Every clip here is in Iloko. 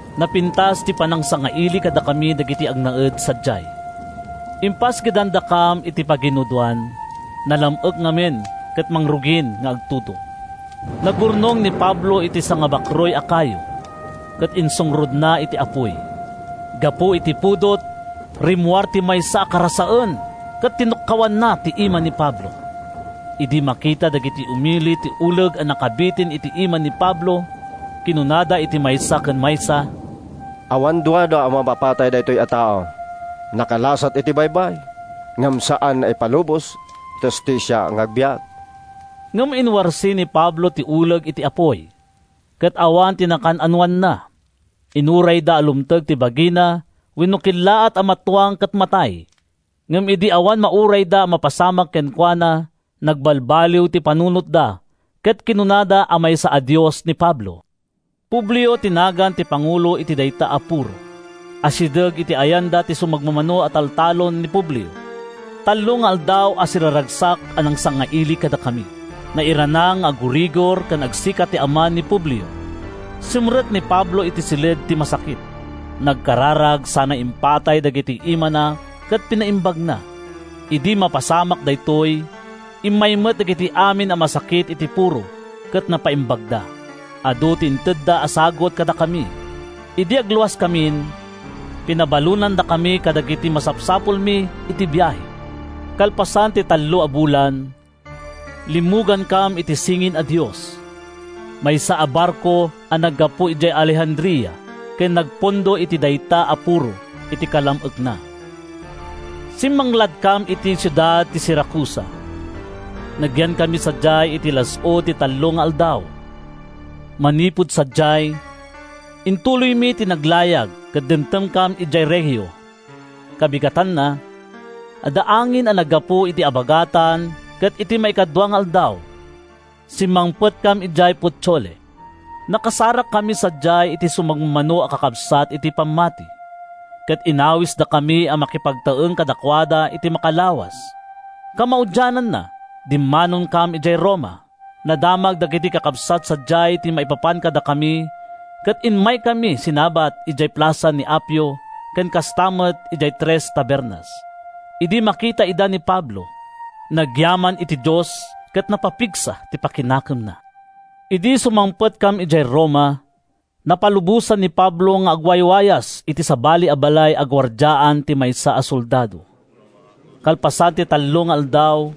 Napintas ti panangsangaili kadakami dagiti agnaed sadiay. Impasgedandakam iti paginudoan. Nalam-ek ngamin ket mangrugin nga agtudo. Nangurnong ni Pablo iti sangabakruy a kayo, ket insungrodna iti apuy. Gapu iti pudot, rimmuar ti maysa a karasaen ket tinukkawanna ti ima ni Pablo. Idi makita dagiti umili ti uleg a nakabitin iti ima ni Pablo, kinunada iti maysa ken maysa, “Awan duadua a mammapatay daytoy a tao. Nakalasat iti baybay, ngem saan nga ipalubos ti hustisia nga agbiag.” Ngem inwarsi ni Pablo ti uleg iti apuy, ket awan ti nakaan-anoanna. Inurayda a lumteg ti bagina wenno kellaat a matuang ket matay, ngem idi awan maurayda a mapasamak kenkuana, nagbalbaliw ti panunotda ket kinunada a maysa a dios ni Pablo. Publio ti nagan ti pangulo iti dayta a puro. Asideg iti ayanda ti sumagmamano a taltalon ni Publio. Tallo nga aldaw a siraragsak a nangsangaili kadakami. Nairana nga aggurigor ken agsika ti ama ni Publio. Simrek ni Pablo iti siled ti masakit. Nagkararag sana impatay dagiti imana ket pinaimbagna. Idi mapasamak daytoy, immay met dagiti amin a masakit iti puro ket napaimbagda. Adu ti intedda a sagut kadakami. Idi agluaskamin, pinabalonandakami kadagiti masapsapulmi iti biahe. Kalpasan ti tallo a bulan, limmugankam iti “Singin a Dios,” maysa a barko a naggapu idiay Alejandria ken nagpundo iti dayta a puro iti kalam-ekna. Simmangladkam iti siudad ti Siracusa. Nagyankami sadiay iti las-ud ti tallo nga aldaw. Manipud sadiay, intuloymi ti naglayag ket dimtengkam idiay Regio. Kabigatanna, adda angin a naggapu iti abagatan ket iti maikadua nga aldaw, simmangpetkam idiay Puteoli. Nakasarakkami sadiay iti sumagmamano a kakabsat iti pammati, ket inawisdakami a makipagtaeng kadakuada iti makalawas. Kamaudiananna, dimmanonkam idiay Roma. Nadamag dagiti kakabsat sadiay ti maipapan kadakami ket immaydakami sinabat idiay Plasa ni Appio ken kasta met idiay Tres Tabernas. Idi makita ida ni Pablo, nagyaman iti Dios ket napapigsa ti pakinakemna. Idi sumangpetkam idiay Roma, napalubosan ni Pablo nga agwaywayas iti sabali a balay a guardiaan ti maysa a soldado. Kalpasan ti tallo nga aldaw,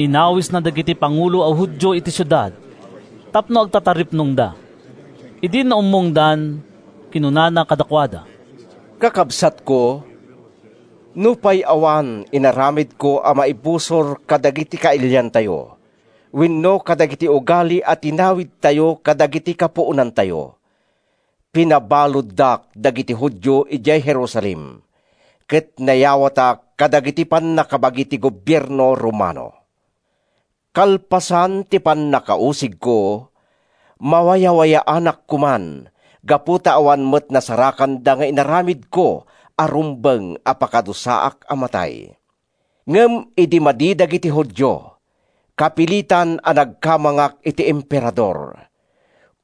inawisna dagiti pangulo a Judio iti siudad tapno agtataripnongda. Idi naummongdan, kinunana kadakuada, “Kakabsatko! Nupay awan inaramidko a maibusor kadagiti kailiantayo wenno kadagiti ugali a tinawidtayo kadagiti kapuonantayo, pinabaluddak dagiti Judio idiay Jerusalem ket nayawatak kadagiti pannakabagi ti gobierno Romano. Kalpasan ti pannakausigko, mawayawayaanak koman gapu ta awan met nasarakanda nga inaramidko a rumbeng a pakadusaak a matay. Ngem idi madi dagiti Judio, kapilitan a nagkamangak iti Emperador,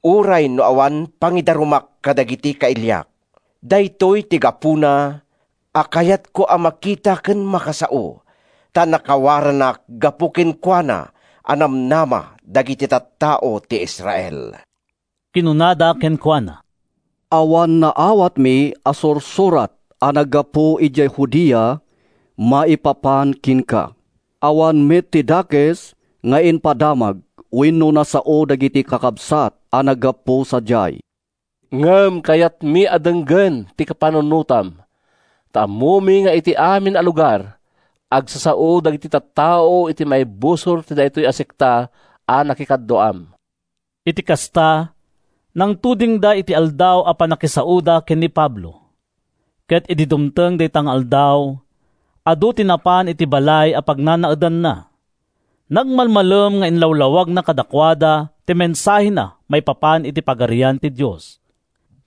uray no awan pangidarumak kadagiti kailiak. Daytoy ti gapuna a kayatkayo a makita ken makasao, ta nakawaranak gapu kenkuana a namnama dagiti tattao ti Israel.” Kinunada kenkuana, “Awan naawatmi a sursurat a naggapu idiay Judea maipapan kenka. Awan met ti dakes nga impadamag wenno nasao dagiti kakabsat a naggapu sadiay. Ngem kayatmi a denggen ti kapanunotam ta ammomi nga iti amin a lugar, agsasao dagiti tattao iti maibusor iti daytoy a sekta a nakikaduaam.” Iti kasta, nangtudingda iti aldaw a pannakisaoda ken ni Pablo, ket idi dumteng dayta nga aldaw, adu ti napan iti balay a pagnanaedanna. Nagmalmalem nga inlawlawagna kadakuada ti mensahena maipapan iti Pagarian ti Dios.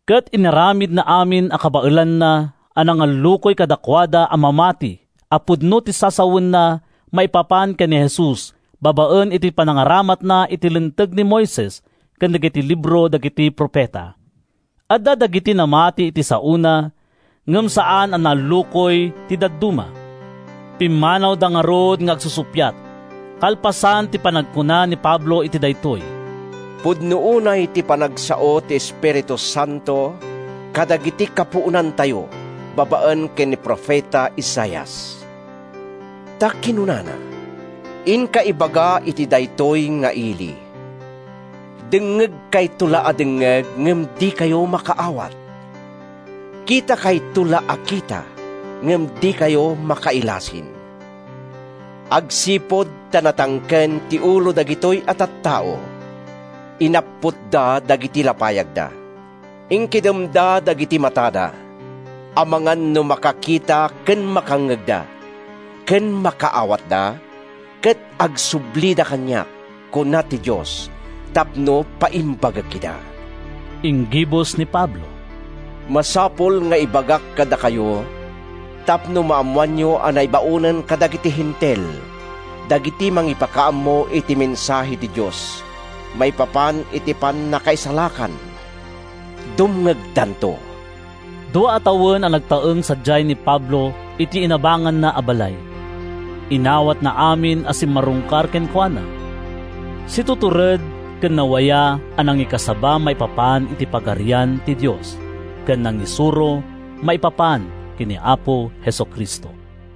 Ket inaramidna amin a kabaelanna a nangallukoy kadakuada a mamati a pudno ti sasawenna maipapan ken ni Jesus babaen iti panangaramatna iti Linteg ni Moises ken dagiti Libro dagiti Profeta. Adda dagiti namati iti saona ngem saan a naallukoy ti dadduma. Pimmanawda ngarud nga agsusuppiat, kalpasan ti panagkuna ni Pablo iti daytoy: “Pudno unay ti panagsao ti Espiritu Santo kadagiti kapuonantayo babaen ken ni profeta Isaias. Ta kinunana, ‘Inka ibaga iti daytoy nga ili: Dengngegkayto la a dengngeg ngem dikayo makaawat; Kitakayto la a kita ngem dikayo makailasin. Agsipud ta natangken ti ulo dagitoy a tattao, Inapputda dagiti lapayagda, Inkidemda dagiti matada, Amangan no makakita ken makangngegda, Ken makaawatda, Ket agsublida kaniak, kuna ti Dios, Tapno paimbagek ida.’” Inggibus ni Pablo: “Masapul nga ibagak kadakayo tapno maammoanyo a naibaonen kadagiti Hentil dagiti mangipakaammo iti mensahe ti Dios maipapan iti pannakaisalakan. Dumngegdanto!” Dua a tawen a nagtaeng sadiay ni Pablo iti inabanganna a balay. Inawatna amin a simmarungkar kenkuana. Situtured ken nawaya a nangikasaba maipapan iti Pagarian ti Dios ken nangisuro maipapan ken ni Apo Jesu-Cristo.